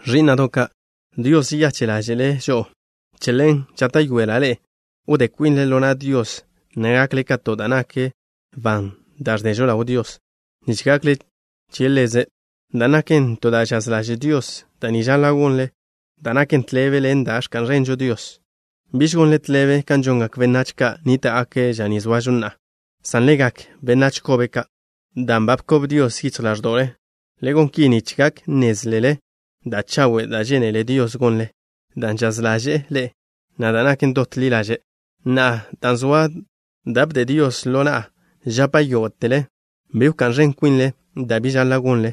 Ẕí'na'do' ka'. Dios žeyache' ḻáže'le' žo'o. Che ḻen žáta'yoela' ḻe'e wdé kwinle ḻo na' Dios, na' gakle ka to da' nak ban da' ẕdežo ḻaw Dios, nich gakle che Ḻeze', dan' naken to da' žaz ḻaže' Dios. Da' ni žaḻa' gonle, da' naken tḻebe ḻen da' ẕka'n ẕenžo Dios. Biž gonle tḻebe kan žongak benách ka' nníta'gake' ža ni zoažo na'a, san le gak benách kobe ka' dan' ba bkob Dios yichj ḻáẕdo'le. Le gon ki nich gak nnézlele da' chawe' da' žénele Dios gonle, dan' žaz ḻaže'e Ḻe', na' da' naken dot li ḻaže'. Na'a, dan' zoa da' bde Dios ḻo na'a, žapa' yógo'tele: bi wká'n ẕen kwinle, da' bi žaḻa' gonle,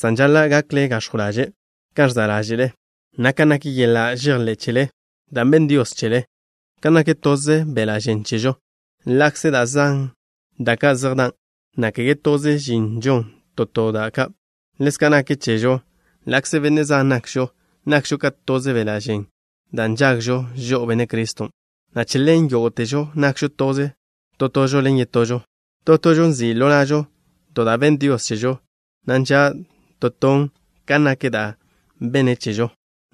san žaḻa' gakle gax̱jw ḻaže' kan ẕza' ḻáže'le, na' kan nak yeḻa' žejḻé' chele da' benn Dios che chele. Kan nak toze beḻa' žen chežo, ḻa'kze da' zan da' ka' zej dan', na' kege toze žin žon to to da' ka', ḻezka' naken chežo. Ḻa'kze benne' zan nakžo, nakžo ka toze beḻa' žen dan' nžagžo žo'o Benne' Criston', na' che ḻen yógo'težo nakžo toze tožo ḻen yetožo. To tožo nzi' ḻo na'žo to da' benn Dios chežo, na' nža' to ton kan nak da' benne' che chežo.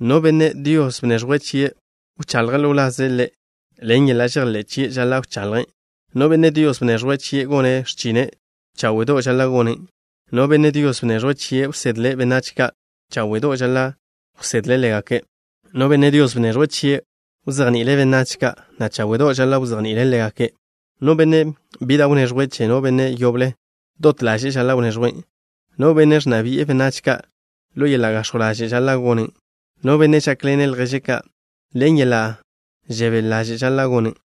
No benne' Dios bneẕjwe' chie' wchaḻje' ḻo wlaze' Ḻe', ḻen yeḻa' žejḻé' chie', žaḻa' wchaḻje'. No benne' Dios bneẕjwe' chie' gone' x̱chine', cháwe'do' žaḻa' gonen'. No benne' Dios bneẕjwe' chie' wsedle' benách ka', cháwe'do' žaḻa' wsedle' ḻégake'. No benne' Dios bneẕjwe' chie' wzejni'ile' benách ka', na' cháwe'do' žaḻa' wzejni'ile' ḻégake'. No benne' bi da' wneẕjwe' che no benne' yoble, dot ḻaže'e žaḻa' wneẕjwen'. No benne' ẕnna bi'e benách ka', ḻo yeḻa' gax̱jw ḻaže' žaḻa' gonen'. No benne' žákḻene' lježe' ka', ḻen yeḻa' žebél žaḻa' gonen'.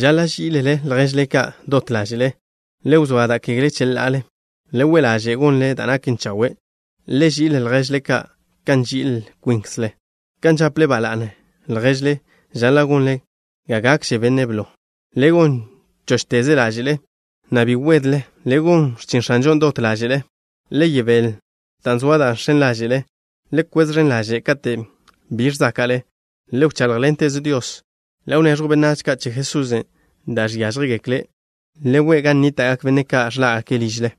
Žaḻa' ží'ilele lježle ka' dot ḻáže'le. Le wzóa da' kegle cheḻa'ale. Le we' ḻaže' gonle da' naken chawe'. Le ži'il lježle ka' kan nži'il kwinkzle. Kan žaple ba la'ne lježle žaḻa' gonle ga gakže' benne' blo. Le gon chóchteze ḻáže'le, na' bi wedle. Le gon x̱chin X̱anžon' dot ḻáže'le. Le yebél dan' zoa da' žx̱en ḻáže'le. Le kwez ẕen ḻaže' kate' bi ẕzáka'le. Le wcháḻjḻenteze Dios. Le wneẕjw benách ka' che Jesusen' da' žiážjegekle'. Le we' gan chejnníta'gak benne' ka' ẕḻá'gake' ližle.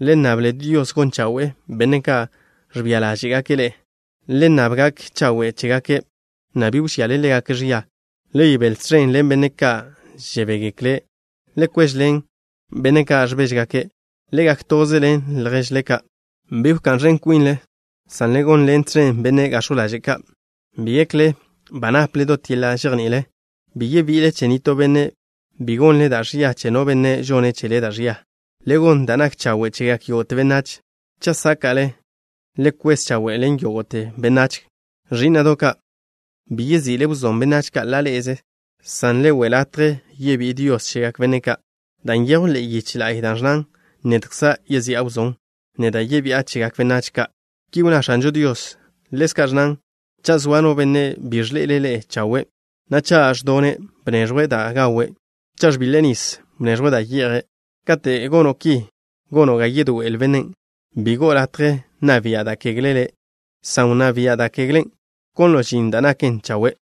Le nnable Dios gon chawe'e benne' ka' ẕbia ḻáže'gake' ḻe'e. Le nnab gak chawe' chégake', na' bi wžiale ḻégake' ẕia. Le yebél tẕen ḻen benne' ka' žebégekle'. Le kwéžeḻen benne' ka' ẕbéžegake'. Le gak toze ḻen lježle ka'. Bi wká'n ẕen kwinle, san le gonḻen tẕen benne' gax̱jw ḻaže' ka'. Bi gekle ba naple dot yeḻa' žejní'il. Bi yebi'ile che nitó benne', bi gonle da' ẕia che no benne' žone' chele da' ẕia. Le gon da' nak chawe' chegak yógo'te benách. Cha' sáke'le, le kwez chawe' ḻen yógo'te benách. Ẕí'na'do' ka', bi yezi'le wzón benách ka' ḻa' ḻe'eze, san le we' latje yebí'i Dios chegak benne' ka', dan' nyejw ḻe'e yiche la'y da' ẕnnan: “Nedkza' yezi'a wzón. Neda' yebi'a chegak benách ka'.” Ki wnná X̱anžo Dios. Ḻezka' ẕnnan: “Cha' zoa no benne' bi ẕḻe'ele' le' chawe', na' cha' ẕdone', bneẕjw da' gawe'. Cha' ẕbiḻe' nis, bneẕjw da' ye'je'.” Kate' gono' ki, gono' ga yedoé'el bennen'. Bi go'o latje nna bia' da' kegle le', san wnná bia' da' keglen', wkonlo' žin da' naken chawe'.